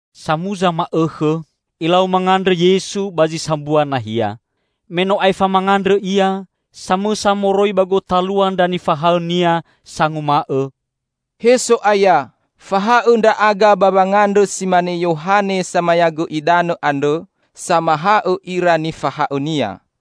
Samuza ma'õkhõ, Ilau mangandrõ Yesu ba zi sambua nahia. Me no aefa mangandrõ Ia, samõsa moroi ba gotalua ndra nifahaõ-Nia sanguma'õ, "He So'aya, fahaõ ndra'aga ba wangandrõ si mane Yohane Samayagõ Idanõ andrõ samahaõ ira nifahaõnia."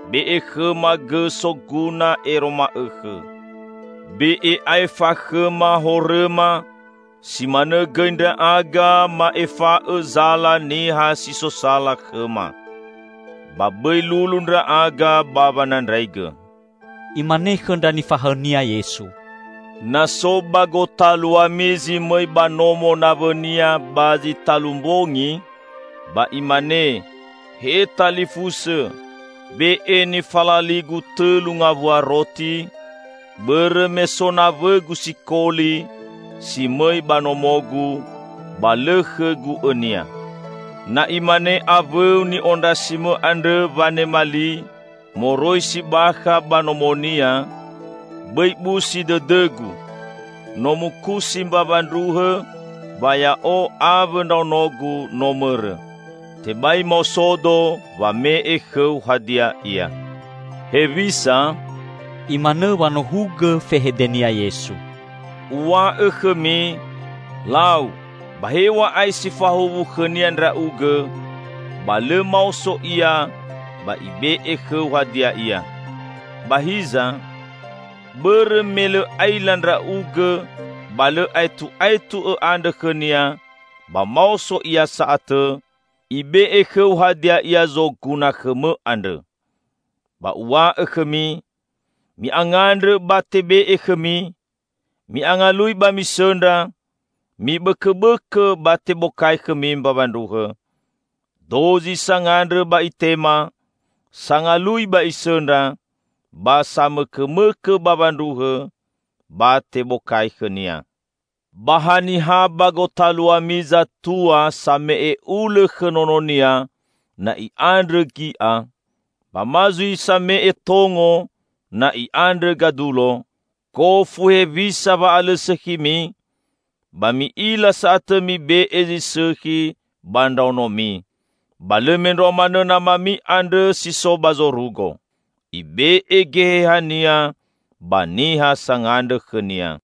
Be'e khõma gõ soguna ero ma'õkhõ. Be'e aefa khõma horõma, si manõ gõi ndra'aga ma'efa'õ zala niha si so sala khõma. Ba bõi lulu ndra'aga ba wanandraigõ.'" Imane khõ ndra nifahaõ-Nia Yesu, "Na so ba gotaluami zi mõi ba nomo nawõnia ba zi talu mbongi, ba imane, 'He talifusõ, be'e nifalaligu tõlu ngawua roti, bõrõ me so nawõgu sikoli si mõi ba nomogu, ba lõ khõgu õnia!' Na imane awõu ni'ondrasimõ andrõ wanema li, moroi si bakha ba nomonia, 'Bõi busi dõdõgu! No mukusi mbawa ndruhõ ba ya'o awõ ndraonogu no mõrõ. Tebai maosodo wame'e khõu hadia ia.'" "Hewisa?" Imanõ wanohugõ fehede-Nia Yesu. "Uw̃a'õ khõmi, lau! Ba hew̃a'ae si fahuwu khõnia ndra'ugõ, ba lõ maoso ia ba ibe'e khõu hadia ia. Ba hiza, bõrõ me lõ aila ndra'ugõ ba lõ aetu'aetu õ'andrõ khõnia, ba maoso ia sa'atõ, ibe'e khõu hadia ia zoguna khõmõ andrõ. Ba Uw̃a'õ khõmi: Mi'angandrõ ba tebe'e khõmi, mi'angalui ba misõndra, mibõkõbõkõ ba tebokai khõmi mbawa ndruhõ. Dozi sangandrõ ba itema; sangalui ba isõndra ba samõkõmõkõ bawa ndruhõ, ba tebokai khõnia. Ba haniha ba gotaluami zatua same'e ulõ khõ nononia, na i'andrõ gi'a? Ba ma zui same'e tongo, na i'andrõ gadulo? Gofu hewisa wa'alõsõkhimi, ba mi'ila sa'atõ mibe'e zi sõkhi ba ndraonomi. Ba lõ mendrua manõ Namami andrõ si so ba zorugo. Ibe'e Geheha-Nia ba niha sangandrõ khõ-Nia!"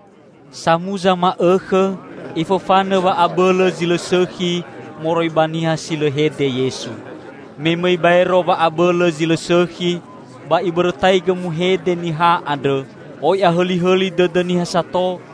Samuza ma'õkhõ Ifofanõ wa'abõlõ zi lõ sõkhi moroi ba niha si lõ hede Yesu. Me mõi baero wa'abõlõ zi lõ sõkhi, ba ibõrõtaigõ muhede niha andrõ. Oi ahõlihõli dõdõ niha sato,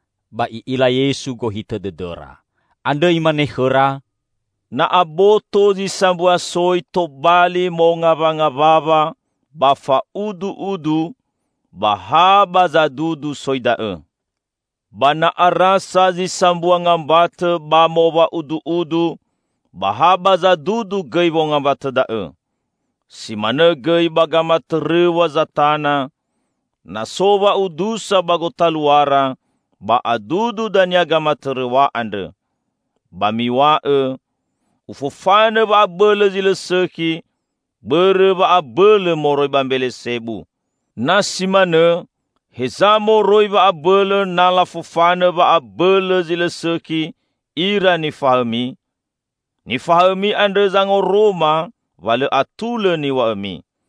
Ba I'ila Yesu gohitõ dõdõra. Andrõ Imane khõra, "Na aboto zi sambua soi tobali mongawangawawa ba fa'udu'udu, ba ha ba zadudu soi da'õ. Ba na arasa zi sambua ngambatõ ba mowa'udu'udu, ba ha ba zadudu gõi wongambatõ da'õ. Si manõ gõi ba gamatõrõw̃a Zatana; na so wa'udusa ba gotaluara, ba adudu dania gamatõrõw̃a andrõ. Ba miw̃a'õ, Ufofanõ wa'abõlõ zi lõ sõkhi bõrõ wa'abõlõ moroi ba Mbelesebu. Na si manõ, heza moroi wa'abõlõ na lafofanõ wa'abõlõ zi lõ sõkhi ira nifahaõmi? Nifahaõmi andrõ zangoroma wa lõ atulõ niw̃a'õmi!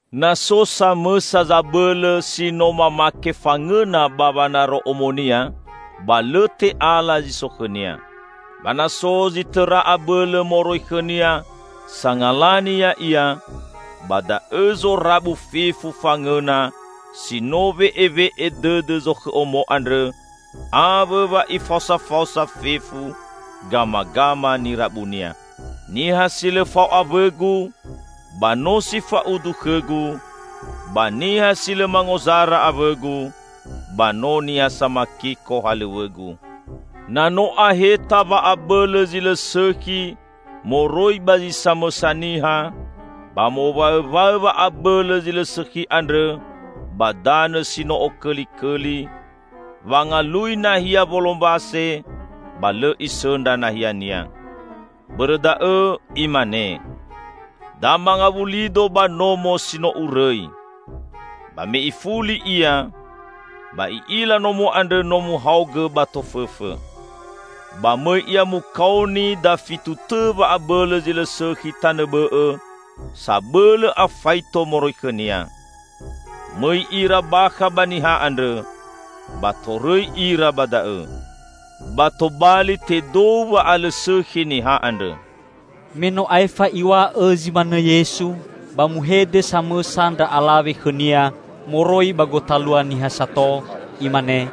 Na so samõsa zabõlõ, si no mamake fangõna ba wanaro omonia, ba lõ te'ala zi so khõnia. Ba na so zi tõra abõlõ moroi khõnia sangalani ya'ia, ba da'õ zorabu fefu fangõna si no we'ewe'e dõdõ zokhõ omo andrõ, awõ wa ifaosafaosa fefu gamagama nirabunia. Niha si lõ fao awõ-Gu, ba no si fa'udu khõ-Gu, ba niha si lõ mangozara awõ-Gu, ba no niha samakiko halõw̃õ-Gu!" "Na no aheta wa'abõlõ zi lõ sõkhi moroi ba zi samõsa niha, ba mowaõwaõ wa'abõlõ zi lõ sõkhi andrõ ba danõ si no okõlikõli, wangalui nahia wolombase, ba lõ isõndra nahiania. Bõrõ da'õ, imane, 'Da mangawulido ba nomo si no urõi!' Ba me ifuli ia, ba i'ila nomo andrõ no muhaogõ ba tofõfõ. Ba mõi ia mukaoni dafitu tõ wa'abõlõ zi lõ sõkhi tanõ bõ'õ sabõlõ afaito moroi khõnia. Mõi ira bakha ba niha andrõ, ba torõi ira ba da'õ. Ba tobali tedou wa'alõsõkhi niha andrõ." Me no aefa Iw̃a'õ zi manõ Yesu, ba muhede samõsa ndra alawe khõ-Nia moroi ba gotalua niha sato, imane,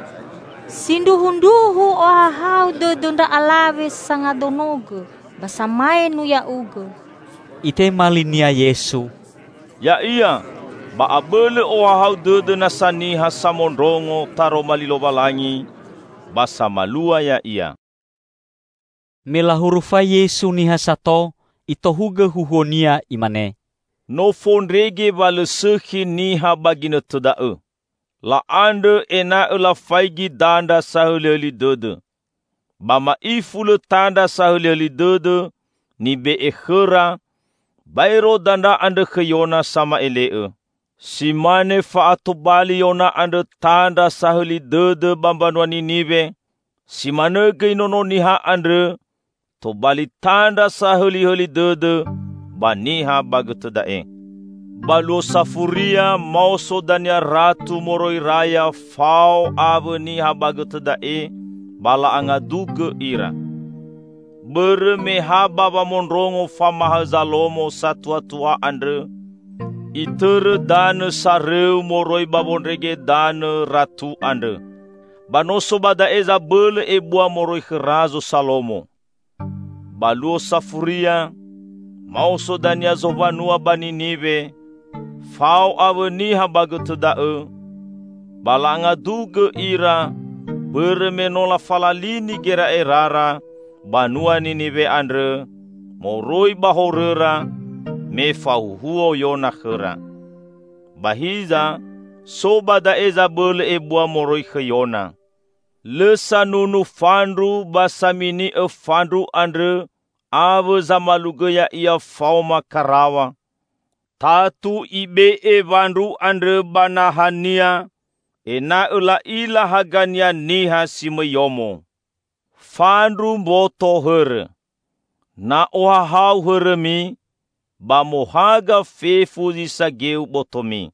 "Sindruhundruhu ohahau dõdõ ndra alawe sangadonogõ ba samaenu Ya'ugõ!" Itema linia Yesu, "Ya'ia, ba abõlõ ohahau dõdõ nasa niha samondrongo Taroma li Lowalangi ba samalua ya'ia!" Me lahurufai Yesu niha sato, Itohugõ huhuo-Nia, Imane, "No fondrege wa lõ sõkhi niha ba ginõtõ da'õ. La'andrõ ena'õ lafaigi dandra sahõlihõli dõdõ. Ba ma'ifu lõ tandra sahõlihõli dõdõ nibe'e khõra, baero dandra andrõ khõ Yona sama'ele'õ. Si mane fa'atobali Yona andrõ tandra sahõli dõdõ ba mbanua Niniwe, si manõ gõi Nono Niha andrõ tobali tandra sahõlihõli dõdõ ba niha ba gõtõ da'e. Ba luo safuria, maoso dania Ratu moroi Raya fao awõ niha ba gõtõ da'e, ba la'angadugõ ira. Bõrõ me ha ba wamondrongo famahaõ Zalomo satuatua andrõ, itõrõ danõ sarõu moroi ba wondrege danõ Ratu andrõ. Ba no so ba da'e zabõlõ ebua moroi khõ Razo Salomo! Ba luo safuria, maoso dania zowanua ba Niniwe fao awõ niha ba gõtõ da'õ, ba la'angadugõ ira bõrõ me no lafalalini gera'erara banua Niniwe andrõ moroi ba horõra, me fahuhuo Yona khõra. Ba hiza so ba da'e zabõlõ ebua moroi khõ Yona!" "Lõ sanunu fandru ba samini'õ fandru andrõ awõ zamalugõ ya'ia faoma karaw̃a. Tatu ibe'e wandru andrõ ba nahania, ena'õ la'ila hagania niha si mõi yomo. Fandru mboto hõrõ. Na ohahau hõrõmi, ba mohaga fefu zi sageu botomi.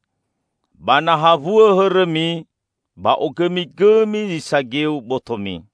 Ba na hawuõ hõrõmi, ba ogõmigõmi zi sageu botomi.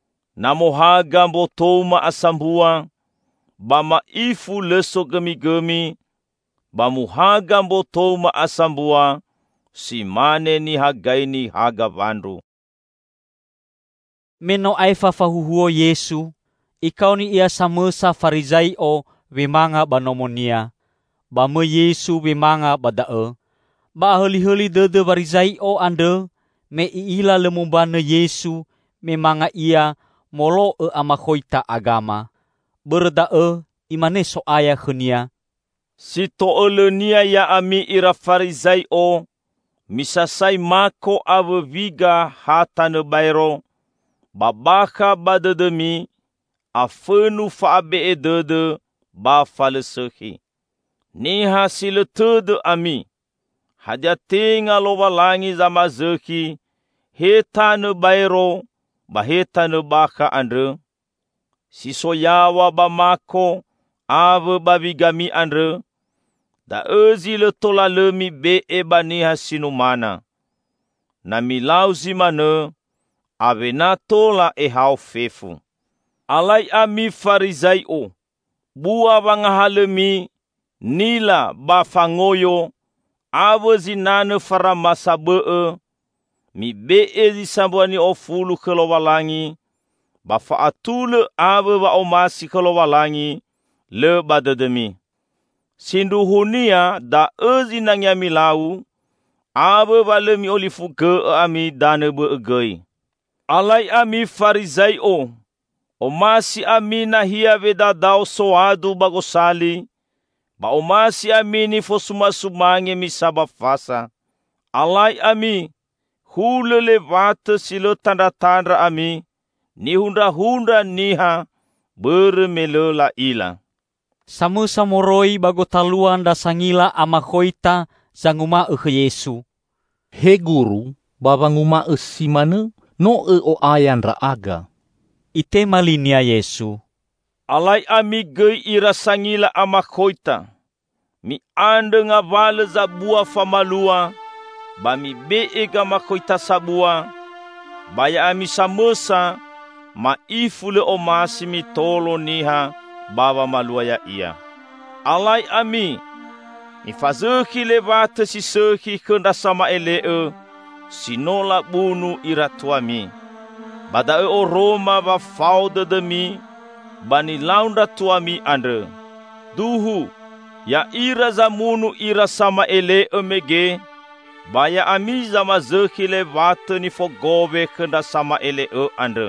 Na mohaga mbotou ma'asambua, ba ma'ifu lõ sogõmigõmi, ba muhaga mbotou ma'asambua si mane nihagaini haga wandru." Me no aefa fahuhuo Yesu, ikaoni la samõsa Farizai'o, wemanga ba nomonia. Ba mõi Yesu wemanga ba da'õ. Ba ahõlihõli dõdõ Warizai'o andrõ me i'ila lõ mombanõ Yesu me manga Ia molo'õ amakhoita agama. Bõrõ da'õ Imane So'aya khõnia, "Si to'õlõnia ya'ami ira Farizai'o, misasai mako awõ wiga ha tanõ baero, ba bakha ba dõdõmi afõnu fa'abe'e dõdõ ba fa lõ sõkhi. Niha si lõ tõdõ ami! Hadia tenga Lowalangi zamazõkhi he tanõ baero ba he tanõ bakha andrõ? Si so yaw̃a ba mako awõ ba wigami andrõ, da'õ zi lõ tola lõ mibe'e ba niha si numana. Na milau zi manõ awena tola ehao fefu. Alai ami, Farizai'o! Bua wangahalõmi, nila ba fangoyo, awõ zinanõ faramasa bõ'õ, mibe'e zi sambua ni'ofulu khõ Lowalangi, ba fa'atulõ awõ wa'omasi khõ Lowalangi lõ ba dõdõmi. Sindruhunia da'õ zinangea milau, awõ wa lõ mi'olifugõ'õ ami danõ bõ'õ gõi. Alai ami, Farizai'o! Omasi ami nahia wedadao soadu ba gosali, ba omasi ami nifosumasumange misa ba fasa. Alai ami! Hulõ lewatõ si lõ tandratandra ami, nihundrahundra niha bõrõ me lõ la'ila!" Samõsa moroi ba gotalua ndra sangila amakhoita zanguma'õ khõ Yesu, "He Guru, ba wanguma'õ si manõ, no õ'o'aya ndra'aga." Itema linia Yesu, "Alai ami gõi ira sangila amakhoita! Mi'andrõ ngawalõ zabua famalua ba mibe'e gamakhoita sabua, ba ya'ami samõsa ma'ifu lõ omasi mitolo niha ba wamalua ya'ia. Alai ami! Mifazõkhi lewatõ si sõkhi khõ ndra sama'ele'õ, si no labunu ira tuami. Ba da'õ oroma wa fao dõdõmi ba nilau ndra tuami andrõ; duhu, ya'ira zamunu ira sama'ele'õ mege ba ya'ami zamazõkhi lewatõ nifogowe khõ ndra sama'ele'õ andrõ.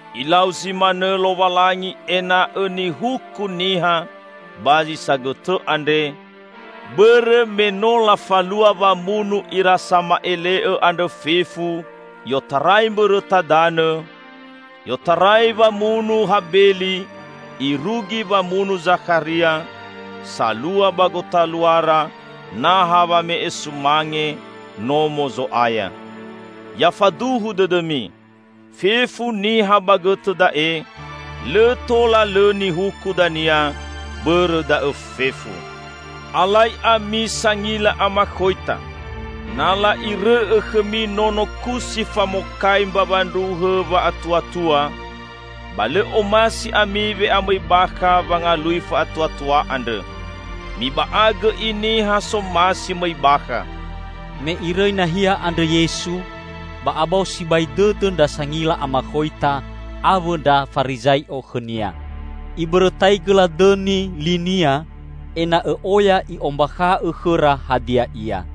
Ilau zi manõ Lowalangi ena'õ nihuku niha ba zi sagõtõ andre, bõrõ me no lafalua wamunu ira sama'ele'õ andrõ fefu i'otarai mbõrõta danõ, i'otarai wamunu Habeli irugi wamunu Zakharia, salua ba gotaluara naha wame'e sumange Nomo Zo'aya. Ya faduhu dõdõmi: Fefu niha ba gõtõ da'e lõ tola lõ nihuku dania bõrõ da'õ fefu. Alai ami, sangila amakhoita! Na la'irõ'õ khõmi nono kusi famokai mbawa ndruhõ wa'atuatua, ba lõ omasi ami we'amõi bakha wangalui fa'atuatua andrõ. Miba'agõ i niha somasi mõi bakha!" Me irõi nahia andrõ Yesu, ba abao sibai dõdõ ndra sangila amakhoita awõ ndra Farizai'o khõ-Nia. Ibõrõtaigõ ladõni li-Nia ena'õ oya I'ombakha'õ khõra hadia ia.